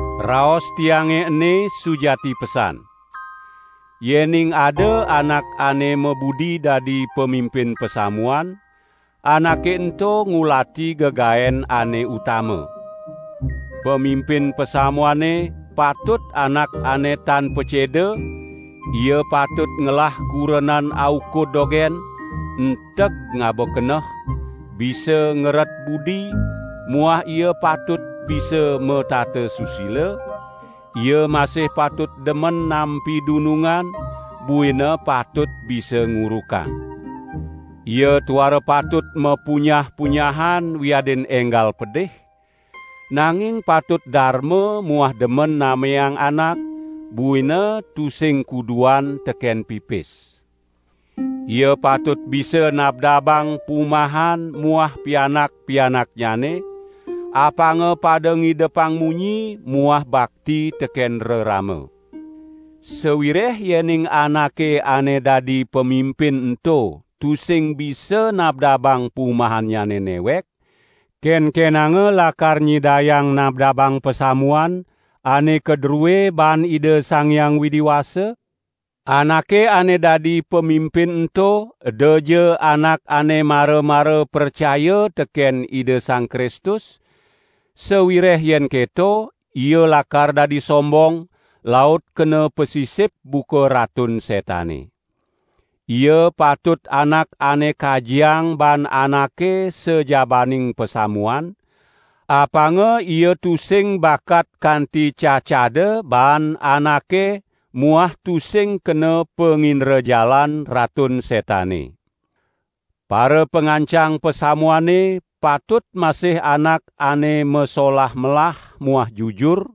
Raos tiange ene sujati pesan. Yening ada anak ane mabudi dadi pamimpin pasamuan, anake ento ngulati gegaen ane utama. Pamimpin pasamuane patut anak ane tan paceda; ia patut ngelah kurenan aukud dogen, enteg ngaba keneh, bisa ngeret budi muah ia patut bisa matata susila; ia masih patut demen nampi dunungan, buina patut bisa ngurukang. Ia tuara patut mapunyah-punyahan wiadin enggal pedih, nanging patut darma muah demen nameang anak; buina tusing kuduan teken pipis. Ia patut bisa nabdabang pumahan muah pianak-pianaknyane, apanga pada ngidepang munyi muah bakti teken rerama. Sawireh yening anake ane dadi pamimpin ento tusing bisa nabdabang pumahannyane newek, kenkenanga lakar nyidayang nabdabang pasamuan ane kadrue baan Ida Sang Hyang Widi Wasa? Anake ane dadi pamimpin ento edaja anak ane mara-mara pracaya teken Ida Sang Kristus, sawireh yen keto, ia lakar dadi sombong, laut kena pasisip buka Ratun Setane. Ia patut anak ane kajiang baan anake sajabaning pasamuan, apanga ia tusing bakat kanti cacada baan anake muah tusing kena pangindrajalan Ratun Setane. Parapangancang pasamuane patut masih anak ane masolah melah muah jujur;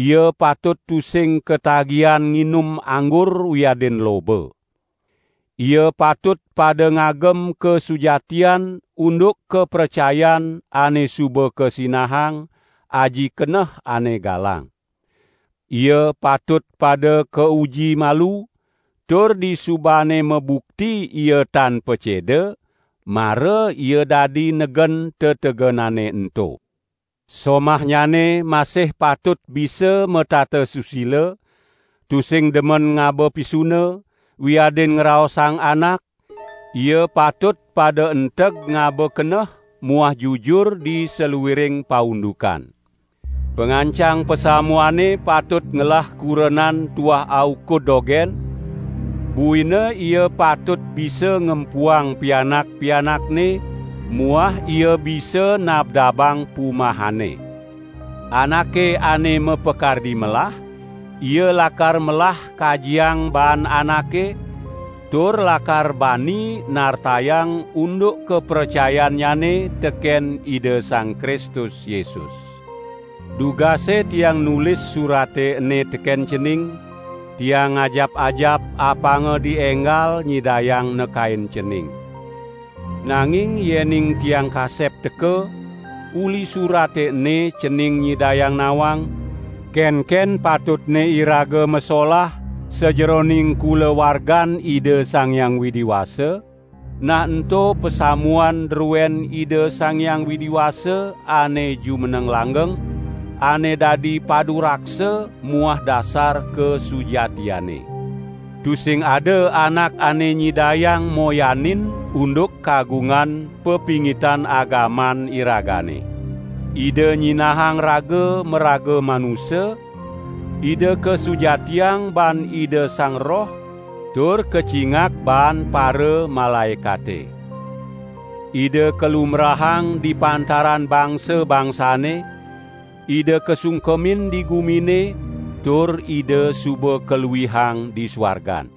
ia patut tusing katagihan nginum anggur wiadin loba. Ia patut pada ngagem kasujatian unduk kapracayan ane suba kasinahang, aji keneh ane galang. Ia patut pada kauji malu, tur disubane mabukti ia tan paceda, mara ia dadi negen tetegenane ento. Somahnyane masih patut bisa matata susila, tusing demen ngaba pisuna, wiadin ngraosang anak; ia patut pada enteg ngaba keneh muah jujur di saluiring paundukan. Pangancang pasamuane patut ngelah kurenan tuah aukud dogen, buina ia patut bisa ngempuang pianak-pianakne muah ia bisa nabdabang pumahanne. Anake ane mapakardi melah, ia lakar melah kajiang baan anake, tur lakar bani nartayang unduk kapracayannyane teken Ida Sang Kristus Yesus. Dugase tiang nulis surate ene teken cening, tiang ngajap-ajap apanga dienggal nyidayang nekain cening. Nanging yening tiang kasep teka, uli surate ene cening nyidayang nawang, kenken patutne iraga masolah sajeroning kulawargan Ida Sang Hyang Widi Wasa, nah ento pasamuan druen Ida Sang Hyang Widi Wasa ane jumeneng langgeng, ane dadi paduraksa muah dasar kasujatiane. Tusing ada anak ane nyidayang moyanin unduk kagungan pepingitan agaman iragane: Ida nyinahang raga maraga manusa, Ida kasujatiang baan Ida Sang Roh tur kacingak baan paramalaekate. Ida kalumbrahang di pantaran bangsa-bangsane, Ida kasungkemin di gumine, tur Ida suba kaluihang di suargan.